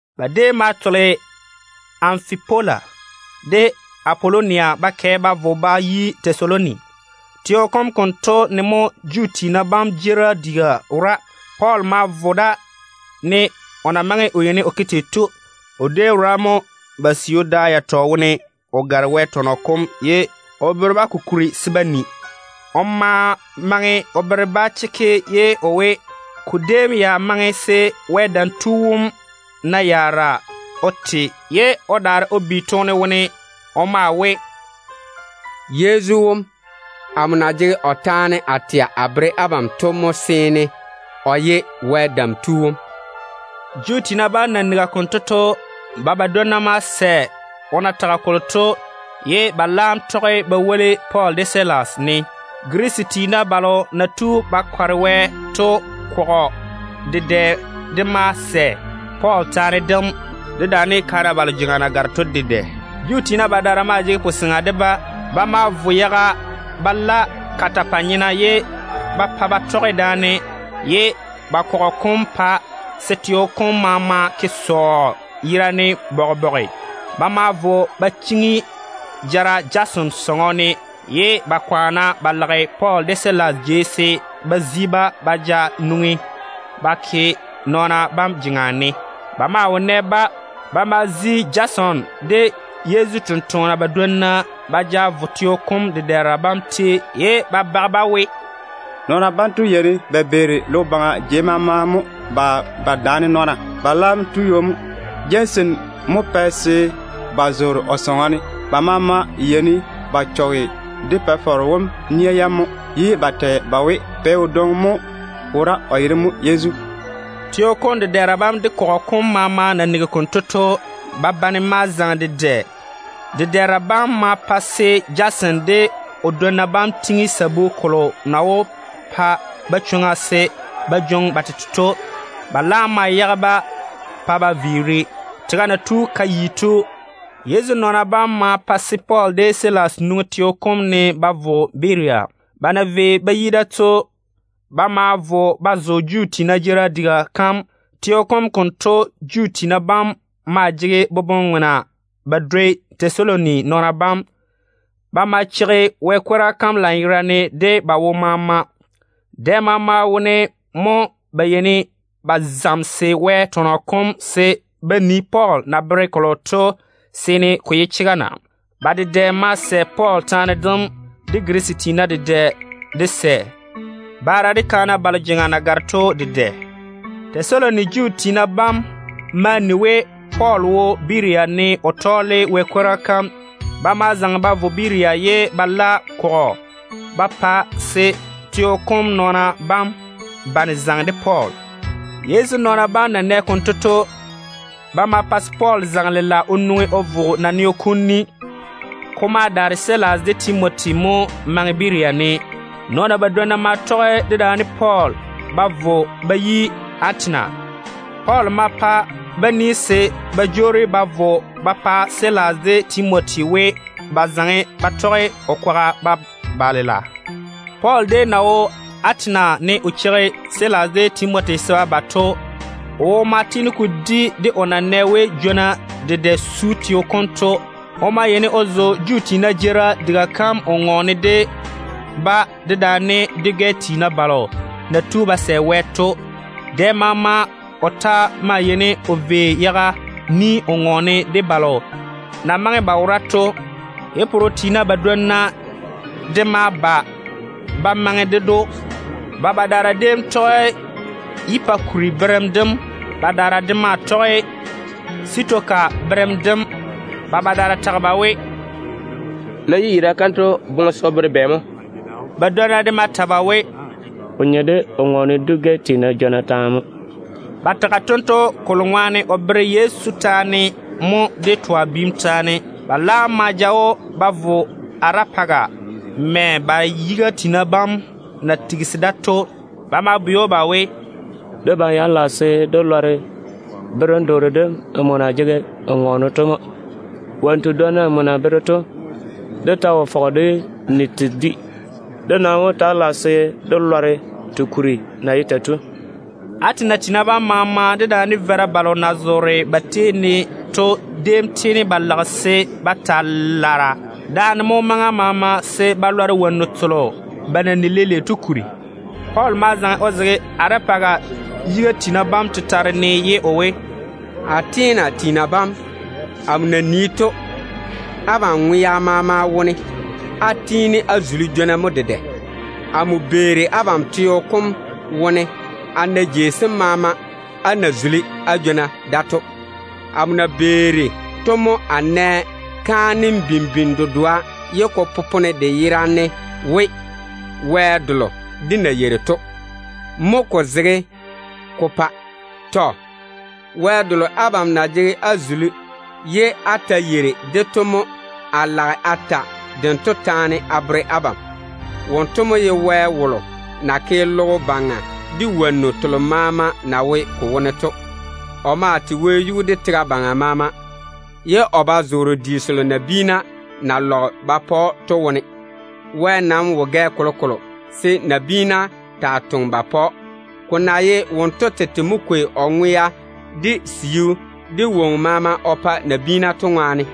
Ba déem ma tole Anfipola de Apolonia ba kɛ ba vo ba yi Tɛsaloni. Teo kom konto ne mo Juu tiina jeerim diga wora. Pɔɔl ma vo da, ne o na maŋe o yeini o ke tei to. O déem wora mo ba siu da yatɔ wone o gare Wɛ tɔnɔ kom ye o bere-ba ko kuri se ba ni. O ma maŋe o bere-ba chekke ye o we, ko déem ya maŋe se Wɛ Dam Tu wom na yaara o te ye o daare o bi toone wone. O maa we, “Yezu wom, amo na jege o taane a tɛa a bere abam to mo seene o ye Wɛ Dam Tu wom.” Juu tiina bam na nigi konto to, ba badwonna ma sɛ o na tage kolo to, ye ba laam tɔge ba woli Pɔɔl de Silas ne. Girisi tiina balo na tu ba kɔre Wɛ to kɔgɔ dedɛ de ma sɛ Pɔɔl taane dem, dedaane kaana balo jeŋa na gare to dedɛ. Juu tiina badaara maa jege puseŋa de-ba. Ba ma vo yaga ba la nɔn-wo-korro ba ke daane. Ba kɔgɔ kom ma pa se bobɔga ja teo kom maama. Ba ma vo ba chiŋi jara Jason sɔŋɔ ne, ye ba kwaane ba lage Pɔɔl de Silas jei se ba zi-ba ba ja nwoŋi ba ke nɔɔna bam jeŋa ne. Ba maa wo nɛ-ba. Ba ma zi Jason de Yezu tɔgena badwonna ba ja vo teo kom dedɛɛra bam tei, ye ba bage ba we, “Nɔɔna banto yeini ba beeri logo baŋa jei maama mo ba daane nɔɔna. Ba laam tu ywo mo. Jason mo pɛ se ba zoore o sɔŋɔ ne. Ba maama yeini ba chɔge dé Pa-faro wom nia yam mo, ye ba tɛ ba we pɛ wodwoŋi mo wora, o yere mo Yezu.” Teo kom dedɛɛra bam de kɔgɔ kom maama na nigi konto to, ba bane ma zaŋe dedɛ. Dedɛɛra bam ma pa se Jason de o dwonna bam tiŋi sabu kolo na wó pa-ba chwoŋa se ba jwoŋi ba tete to. Ba laam ma yage-ba pa ba viiri. Tega na tu ka yi to, Yezu nɔɔna bam ma pa se Pɔɔl de Silas nwoŋi teo kom ne ba vo Berea. Ba na vei ba yi da to, ba ma vo ba zo Juu tiina jeerim diga kam. Teo kom konto Juu tiina bam maa jege boboŋ-ŋona ba dwoi Tɛsaloni nɔɔna bam. Ba ma cheigi Wɛ kwora kam lanyerane de ba wo maama. Dɛ maama wone mo ba yeini ba zamese Wɛ tɔnɔ kom se ba nii Pɔɔl na bere kolo to seene ko ye chega na. Ba dedɛ ma sɛ Pɔɔl taane dem, de Girisi tiina dedɛ de sɛ, baara de kaana balo jeŋa na gare to dedɛ. Tɛsaloni Juu tiina bam ma ni we Pɔɔl wo Berea ne o tɔɔle Wɛ kwora kam. Ba ma zaŋe ba vo Berea ye ba la kɔgɔ ba pa se teo kom nɔɔna bam bane zaŋe de Pɔɔl. Yezu nɔɔna bam na nɛ konto to, ba ma pa se Pɔɔl zaŋe lela o nwoŋi o vo naneo kom ni. Ko ma daare Silas de Timoti mo maŋe Berea ne. Nɔɔna badwonna ma tɔge dedaane Pɔɔl ba vo ba yi Atena. Pɔɔl ma toŋe-ba se ba jwoori ba vo ba pa Silas de Timoti ni we, ba zaŋe ba tɔge o kwaga ba ba lela. Pɔɔl déem na wo Atena ne o cheigi Silas de Timoti se ba ba to, o wo ma tiini ko di de o na nɛ we jwona dedɛ su teo kom to. O maa yeini o zo Juu tiina jeerim diga kam o ŋɔɔne dedaane ba de dwi-gɛ tiina balo na tu ba sɛ Wɛ to. Dɛ maama o ta maa yeini o vei yaga ni o ŋɔɔne de balo na maŋe ba wora to. Yi-pore-nyena badwonna de ma ba ba dwoni ded‑o. Ba badaara déem tɔge Epikuri berem dem, badaara de maa tɔge Sitoka berem dem. Ba badaara tage ba we, “Yiyira kanto boŋe se o bere bɛ mo?” Badwonna de ma ta ba we, “Ko nye de o ŋɔɔne sa-teena jwona taane mo.” Ba tage tento kolo ŋwaane o tɔɔle kwor-ywoŋa kalo na tɛ Yezu de twa biim taane to mo. Ba laam ma ja‑o ba vo Arɛpaga, mɛ ba yiga tiina bam na tigisi daane to. Ba ma bwei‑o ba we, “Debam ya lage se dé lɔre berem-doore dem nmo na jege n ŋɔɔne to mo. Wonnu tedwonna nmo na bere to, dé ta wo fɔge dé ni te dwi. Dé nam wó taa lage se dé lɔre te kuri na ye tei to.” Atena tiina bam maama dedaane veira balo na zoore ba tei ne to déem tiini ba lage se ba taa lare daane mo maŋa maama, se ba lɔre wonnu telo ba na ni leile to kuri. Pɔɔl ma zaŋe o zege Arɛpaga yiga tiina bam tetare ne ye o we: “Atena tiina bam, amo na nii to, abam ŋwea maama wone á tiini á zuli jwona mo dedɛ. Amo beeri abam teo kom wone a nii a na jei sem maama á na zuli á jwona da to. Amo na beeri to mo a nɛ kaanem bimbini dedoa ye ko popone de yera ne we, ‘WƐ DELO DÉ NA YEIRI TO’ mo ko zege ko pae. Tɔ. Wɛ delo abam na jege á zuli ye á ta yeiri-de to mo a lage a ta dento taane a bere abam. Wonto mo ye Baŋa Wɛ wolo na ke logo baŋa de wonnu telo maama na wo ko wone to. O maa tei wɛyuu de tega baŋa maama, ye o ba zoore di selo nabiina na lɔge ba pa‑o to wone. Wɛ nam wo gɛ kolokolo se nabiina taa toŋa ba pa‑o, ko na ye wonto tete mo kwei ŋwea, de siu, de woŋo maama o pa nabiina to ŋwaane.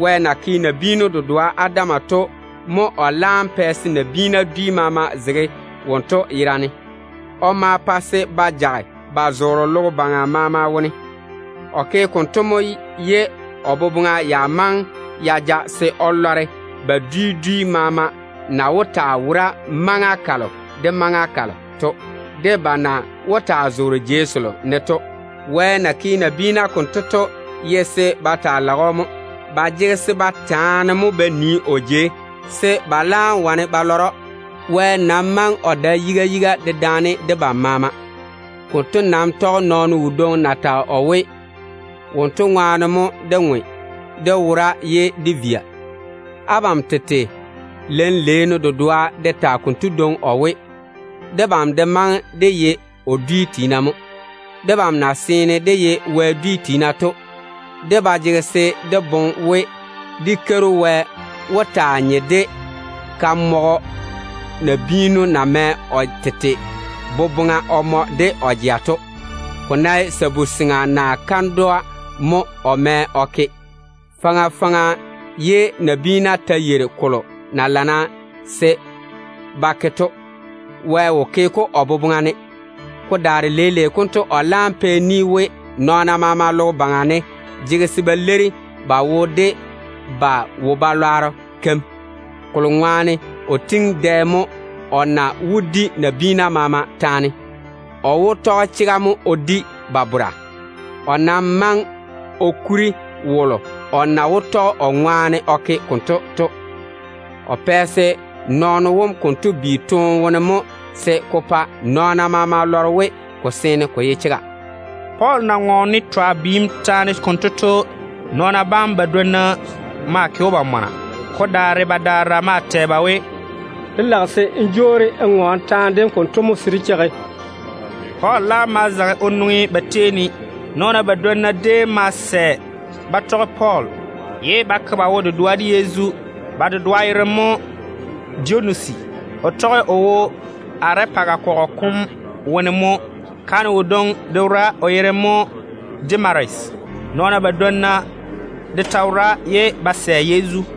Wɛ na ke nabiinu dedoa Adam to mo o laam pɛ se nabiina dwi maama zege wonto yera ne. O ma pa se ba jage ba zoore logo baŋa maama wone. O ke konto mo ye o boboŋa ya maŋe ya ja se o lɔre ba dwi dwi maama na wó taa wora maŋa kalo de maŋa kalo to, de ba na wó taa zoore jei selo ne to. Wɛ na ke nabiina konto to ye se ba kwaane se ba lɔre-o mo. Ba jege se ba taane mo ba nii o jei, se ba laam wane ba lɔre‑o. Wɛ nam maŋe o dae yiga yiga dedaane debam maama. Konto nam tɔge nɔɔno wodwoŋi na tage o we, ‘Wonto ŋwaane mo dé ŋwe dé wora ye dé via.’ Abam tete lein-leenu dedoa de tage konto dwoŋi o we, ‘Debam de maŋe dé ye o bia mo.’ Debam na seene dé ye Wɛ bia to, dé ba jege se dé boŋe we dé Keiru Wɛ wó taa nye de kamɔgɔ nabiinu na mɛ o tete boboŋa o mɔ de o jea to, ko ná ye sabu-seŋa naa lu-nyenno naa kandwa mo o mɛ o ke. Faŋa faŋa ye nabiina ta yeiri kolo na lana se ba ke to, Wɛ wo ke-ko o boboŋa ne. Ko daare leile konto o laam pɛ ni we, nɔɔna maama logo baŋa ne jege se ba leiri ba wo de ba wo-balwaaro keim. Kolo ŋwaane o tiŋi dɛ mo o na wó di nabiina maama taane. O wó tɔge chega mo o di ba bora. O nam maŋe o kuri wolo o na wó tɔge o ŋwaane o ke konto to. O pɛ se nabiinu wom konto bi toone wone mo se ko pa nɔɔna maama lɔre we ko seene ko ye chega.” Pɔɔl na ŋɔɔne twa biim taane konto to, nɔɔna bam badwonna maa ke‑o ba mɔna. Ko daare badaara maa tɛ ba we, “Dé lage se n jwoori n ŋɔɔne taane dem konto mo se dé daa cheigi.” Pɔɔl laam ma zaŋe o nwoŋi o daare-ba. Nɔɔna badwonna déem ma sɛ ba tɔge Pɔɔl, ye ba ke ba wo-dedoa de Yezu. Ba dedoa yere mo Dionusi. O tɔge o wo Arɛpaga kɔgɔ kom nɔɔno dedoa mo. Kaane wodwoŋi de wora, o yere mo Damaris. Nɔɔna badwonna de ta wora ye ba sɛ Yezu.